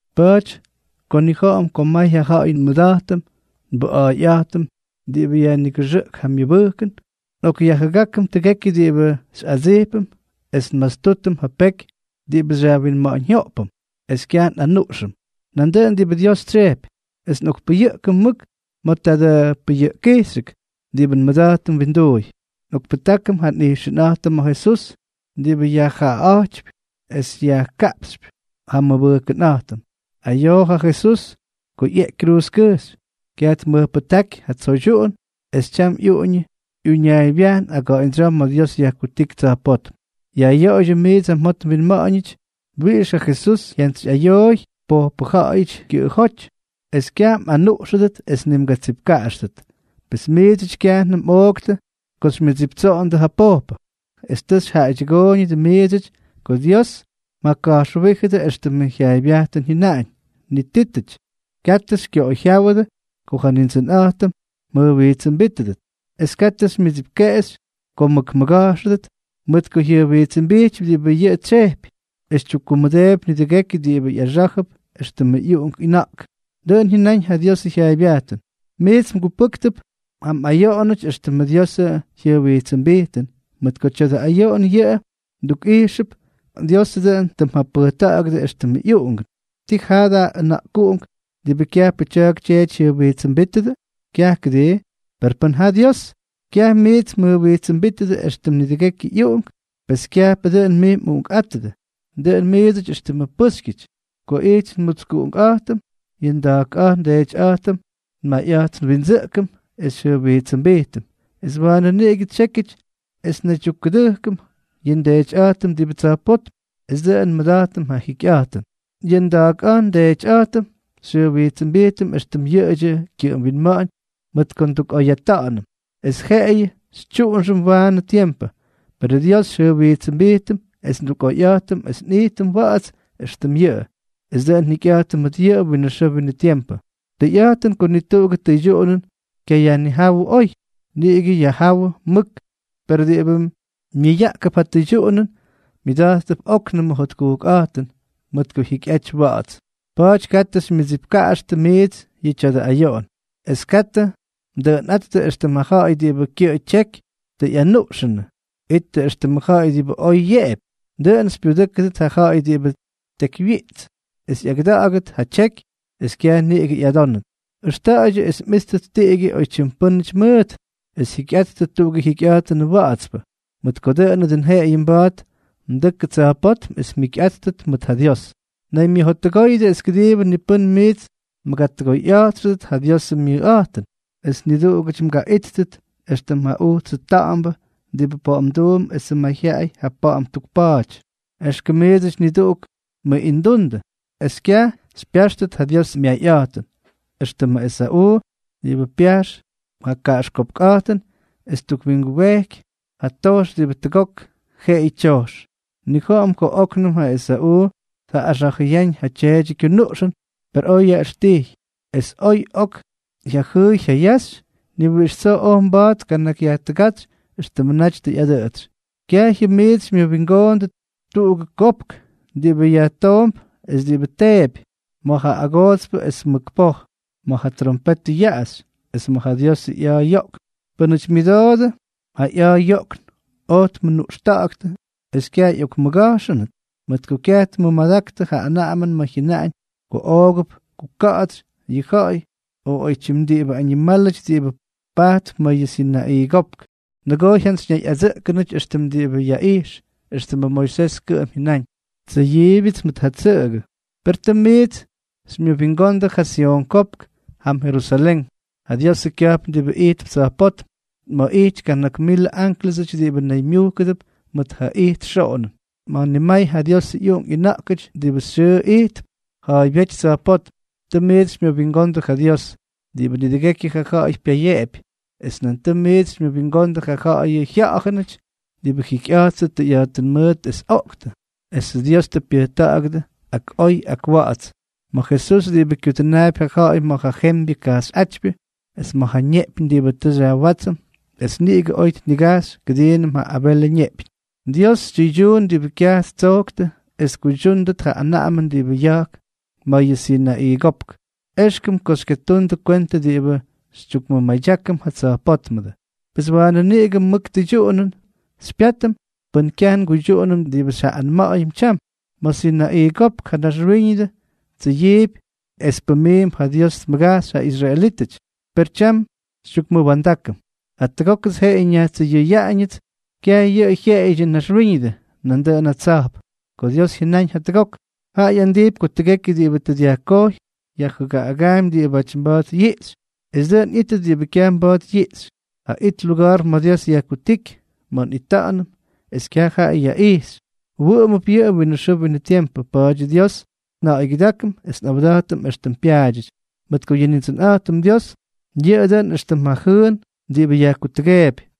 Pa̱a̱ty ko nnija̱ꞌa̱m ko may ja ja̱ꞌa̱y nmʉda̱jtʉm nbʉꞌa̱a̱yꞌa̱jtʉm diꞌibʉ yajnigʉxʉꞌk ja myʉbʉjkʉn, nꞌokꞌyajjʉgákʉm tʉgekyʉ diꞌibʉ xyꞌadsijpʉm, es nmatstútʉm ja peky diꞌibʉ xyajwinma̱ꞌa̱ñjyoꞌpʉm, es kyaj nꞌanuꞌxʉm nduꞌunʉm diꞌibʉ Dios tsyejpy, es nꞌokpayʉꞌkʉm mʉk ma̱ tadʉ pʉyʉꞌkkijxyʉk diꞌibʉ nmʉda̱jtʉm winduuy. Nꞌokpʉjtákʉm ja nꞌijxʉnꞌa̱jtʉm ma̱ Jesús, diꞌibʉ yajjaaꞌa̱jtypy es yajkaꞌpxypy ja nmʉbʉjkʉnꞌa̱jtʉm. Ayoo ja Jesús ko ꞌyeꞌky kruuzkʉjxy, kyaj tmʉjpʉjtáky ja tsoydyuꞌun, es tyam ꞌyuꞌuñʉ ꞌyuñaaybyajn aga̱ꞌa̱ñdsyoo ma̱ Dios yajkutíky tsa̱jpótm. Yajꞌyoꞌoydyʉ miidsʉty ja mjot mwinma̱ꞌa̱ñ wiꞌix ja Jesús jyantsyꞌayooy pojpʉ ja̱ꞌa̱yʉty kyʉꞌʉjóty, es kyaj mꞌanuꞌxʉdʉt es ni mgatsipkaꞌaxtʉt. Pes miidsʉty kyajnʉm mꞌooktʉ ko xymyʉdsiptsoondʉ ja pojpʉ; es tʉ xyjaꞌaydyʉgóydyʉ miidsʉty ko Dios mjaka̱jxwíjʉdʉ éxtʉmʉ jyaaybyajtʉn jyʉnaꞌañ: Nitítʉty, katʉ xykyoꞌoyjyáwʉdʉ ko ja Nindsʉnꞌa̱jtʉm mjʉjwijtsʉmbítʉdʉt, es katʉ xymyʉdsipkeꞌexy ko mmʉkmʉga̱jxʉdʉt, mʉt ko jyʉjwijtsʉmbijtypy diꞌibʉ yʉꞌʉ tsyejpy, es tyukkumʉdeepy nidʉgekyʉ diꞌibʉ ꞌyaxá̱jʉp éxtʉmʉ ꞌyuꞌunk ꞌyʉna̱ꞌk. Dʉꞌʉn jyʉnaꞌañ ja Diosʉ jyaaybyajtʉn. Miits mgupʉ́ktʉp ja mꞌayoꞌonʉty éxtʉmʉ Diosʉ jyʉjwijtsʉmbijtʉn, mʉt ko tya̱dʉ ayoꞌon yʉꞌʉ mdukꞌijxʉp ko Dios dʉꞌʉn mjapʉjta̱ꞌa̱gʉdʉ éxtʉmʉ ꞌyuꞌungʉ. ¿Tii jaa da ʉna̱ꞌkuꞌunk diꞌibʉ kyajpʉ tya̱a̱k tyeety jyʉjwijtsʉmbítʉdʉ? Kyaj, ¿kʉdii? Per pʉn ja Dios kyaj miits mjʉjwijtsʉmbítʉdʉ éxtʉm nidʉgekyʉ ꞌyuꞌunk, pes kyajpʉ dʉn mij mꞌuꞌunkꞌátʉdʉ, dʉꞌʉn miidsʉty éxtʉmʉ pʉ́xykyʉty. Ko ijty nmutskuꞌunkꞌa̱jtʉm, yʉ nda̱a̱kꞌa̱jt ndeetyꞌa̱jtʉm nmayꞌa̱jt nwindsʉꞌkʉm, es xyjʉjwijtsʉmbijtʉm, es waanʉ niꞌigʉ tsyékyʉty es nnaydyukkʉdʉjkʉm yʉ nDeetyꞌa̱jtʉm diꞌibʉ tsa̱jpótm, es dʉꞌʉn nmʉda̱jtʉm ja jikyꞌa̱jtʉn. Yʉ nda̱a̱kꞌa̱jt ndeetyꞌa̱jtʉm xyjʉjwijtsʉmbijtʉm éxtʉm yʉꞌʉdyʉ kyʉꞌʉm winma̱ꞌa̱ñ mʉt ko ndukꞌoyꞌata̱ꞌa̱nʉm, es jeꞌeyʉ xytyuꞌunxʉm waanʉ tiempʉ; perʉ Dios xyjʉjwijtsʉmbijtʉm es ndukꞌoyꞌa̱jtʉm es nꞌijtʉm wa̱ꞌa̱ts éxtʉm yʉꞌʉ, es dʉꞌʉn njikyꞌa̱jtʉm mʉt yʉꞌʉ winʉ xʉʉ winʉ tiempʉ. Tʉyꞌa̱jtʉn ko ni tuꞌugʉ tʉydyuꞌunʉn kyayajjáwʉ oy, niꞌigʉ yajjáwʉ mʉk; per diꞌibʉ myʉyaꞌkʉp ja tʉydyuꞌunʉn, myʉda̱jttʉp óknʉmʉ jotkujkꞌa̱jtʉn mʉt ko jyikyꞌaty wa̱ꞌa̱ts. Pa̱a̱ty, katʉ xymyʉdsipkaꞌaxtʉ miits yʉ tya̱dʉ ayoꞌon, es katʉ mdʉꞌʉnꞌáttʉ éxtʉmʉ ja̱ꞌa̱yʉty diꞌibʉ kyʉꞌʉ tyeky tʉ ꞌyanuꞌxʉnʉ; ittʉ éxtʉmʉ ja̱ꞌa̱y diꞌibʉ oy yeꞌepy, dʉꞌʉn xypyudʉ́kʉdʉt ja ja̱ꞌa̱y diꞌibʉ tekywyiꞌits, es ꞌyagʉda̱ꞌa̱gʉt ja tyeky, es kyaj niꞌigʉ ꞌyadónʉt. Ʉxta̱ꞌa̱ydyʉ es mꞌíttʉt tiꞌigyʉ oytyim pʉ́nʉty mʉʉt, es jikyꞌattʉ tuꞌugʉ jikyꞌa̱jtʉnʉ wa̱ꞌa̱tspʉ, mʉt ko dʉꞌʉnʉ dʉn jeꞌeyʉ mba̱a̱t mdʉkʉ tsa̱jpótm es mjikyꞌáttʉt mʉt ja Dios. Naymyʉjottʉgóyʉdʉ es kʉdiibʉ ni pʉ́n miits mgatʉgoyꞌa̱jtxʉdʉt ja Diosʉ myayꞌa̱jtʉn, es niduꞌugʉty mgaꞌíttʉt éxtʉm ja ujtsʉ ta̱ꞌa̱mbʉ diꞌibʉ pa̱ꞌa̱mduump esʉ mayjyaꞌay ja pa̱ꞌa̱m ttukpa̱a̱ty. Exkʉm miidsʉty niduꞌuk mmʉꞌindundʉ, es kyaj xypyáxtʉt ja Diosʉ myayꞌa̱jtʉn, éxtʉmʉ Esa̱ꞌuu, diꞌibʉ pyajxy ja kaꞌaxkopkꞌa̱jtʉn es ttukwingubejky ja tojx diꞌibʉ tʉgok jeꞌeyʉ tyojxy. Nnija̱ꞌa̱m ko óknʉm ja Esa̱ꞌuu tjaꞌꞌaxa̱jʉyáñ ja tyeedyʉ kyunuꞌxʉn, per oj yaꞌʉxtijy; es oy ok jyajʉʉy jyayaxy, ni wiꞌix tsoo oj mba̱a̱t tkanakyyajtʉgátsy éxtʉmʉ naty tʉ ꞌyadʉꞌʉtsy. Kyajyʉm miits xymyʉwingoondʉ tuꞌugʉ kopk diꞌibʉ yajtoomp es diꞌibʉ teepy, ma̱ ja agoodspʉ esʉ mʉk poj, ma̱ ja trompetʉ yaꞌaxy, es ma̱ ja Diosʉ ꞌya̱a̱ yoꞌkn. Pʉ́nʉty myʉdoodʉ ja ꞌya̱a̱ yoꞌkn oj tmʉnuꞌxta̱ꞌa̱ktʉ es kyaj ꞌyokmʉga̱jxʉnʉt, mʉt ko kyaj tmʉmadaktʉ ja anaꞌamʉn ma̱ jyʉnaꞌañ ko oogʉp kuka̱ꞌa̱tsy yʉ ja̱ꞌa̱y o oytyim diꞌibʉ añimálʉty diꞌibʉ pajtp ma̱ yʉ Sinaꞌii Kopk. Nʉgoo jyantsyñayꞌadsʉꞌkʉnʉty éxtʉm diꞌibʉ yaꞌijx, éxtʉmʉ Moisés kʉꞌʉm jyʉnáñ: “Tsʉyiibyʉts mʉt ja tsʉꞌʉgʉ.” Per tʉ miits xymyʉwingondʉ ja Syon Kopk jam Jerusalén, ja Diosʉ kya̱jpn diꞌibʉ ijtp tsa̱jpótm, ma̱ ꞌyity kana̱k milʉ ánklʉsʉty diꞌibʉ naymyujkʉdʉp mʉt ja ijt xoꞌonʉn, ma̱ nimay ja Diosʉ ꞌyuꞌunk ꞌyʉna̱ꞌkʉty diꞌibʉ xyʉʉ ijtp ja̱a̱ybyéty tsa̱jpótm. Tʉ miits xymyʉwingondʉ ja Dios, diꞌibʉ nidʉgekyʉ ja ja̱ꞌa̱y pyayeꞌepy, es nan tʉ miits xymyʉwingondʉ ja ja̱ꞌa̱yʉ jya̱ꞌa̱jʉnʉty diꞌibʉ jikyꞌa̱jttʉ tʉyꞌa̱jtʉn mʉʉt es oꞌktʉ, esʉ Dios tʉ pyʉjta̱ꞌa̱gʉdʉ ak oy ak wa̱ꞌa̱ts, ma̱ Jesús, diꞌibʉ kyudʉnaapy ja ja̱ꞌa̱y ma̱ ja jembyʉ kajxyꞌátypyʉ, es ma̱ ja neꞌpyñ diꞌibʉ tʉ xyajwátsʉm es niꞌigʉ oy tnigajxy kʉdiinʉm ja Abelʉ ñeꞌpyñ. Dios tyʉydyuun diꞌibʉ kyaj ttsojktʉ es tkuydyúndʉt ja anaꞌamʉn diꞌibʉ ya̱jk ma̱ yʉ Sinaꞌii Kopk. Exkʉm ko xykyatundʉ kwentʉ diꞌibʉ xytyukmʉmadyákʉm ja tsa̱jpótmʉdʉ. Pes waanʉ niꞌigʉ mʉkʉ tʉydyuꞌunʉn xypyátʉm pʉn kyaj nguydyuꞌunʉm diꞌibʉ xyjaꞌꞌanma̱ꞌa̱yʉm tyam. Ma̱ Sinaꞌii Kopk ja naxwíñʉdʉ tsʉyiipy es pʉmiimp ko Dios tmʉgajxy ja israelítʉty. Per tyam xytyukmʉwa̱ndákʉm: “Jatʉgókʉts jeꞌeyʉ nyajtsʉyʉyaꞌañʉts kyaj yʉꞌʉ jyeꞌeyʉdyʉ naxwíñʉdʉ, nandʉꞌʉn ja tsa̱jp.” Ko Dios jyʉnáñ “jatʉgok”, jaꞌa ꞌyandijpy ko tʉgekyʉ diꞌibʉ tʉ dyajkojy, yajjʉgaꞌagaampy diꞌibáty mba̱a̱t yiꞌxy, es dʉꞌʉn ꞌyítʉt diꞌibʉ kyaj mba̱a̱t yiꞌxy. Ja it luga̱a̱r ma̱ Dios yajkutíky, ma̱ nꞌita̱ꞌa̱nʉm es kyaj jaꞌa yajꞌíxy, wʉꞌʉmʉp yʉꞌʉ winʉ xʉʉ winʉ tiempʉ. Pa̱a̱dyʉ Dios nja̱ꞌa̱ygyʉdákʉm es nꞌawda̱jtʉm éxtʉm pyaadyʉty, mʉt ko yʉ Nindsʉnꞌa̱jtʉm Dios, dʉꞌʉn yʉꞌʉ éxtʉm ja jʉʉn diꞌibʉ yajkutʉgeepy.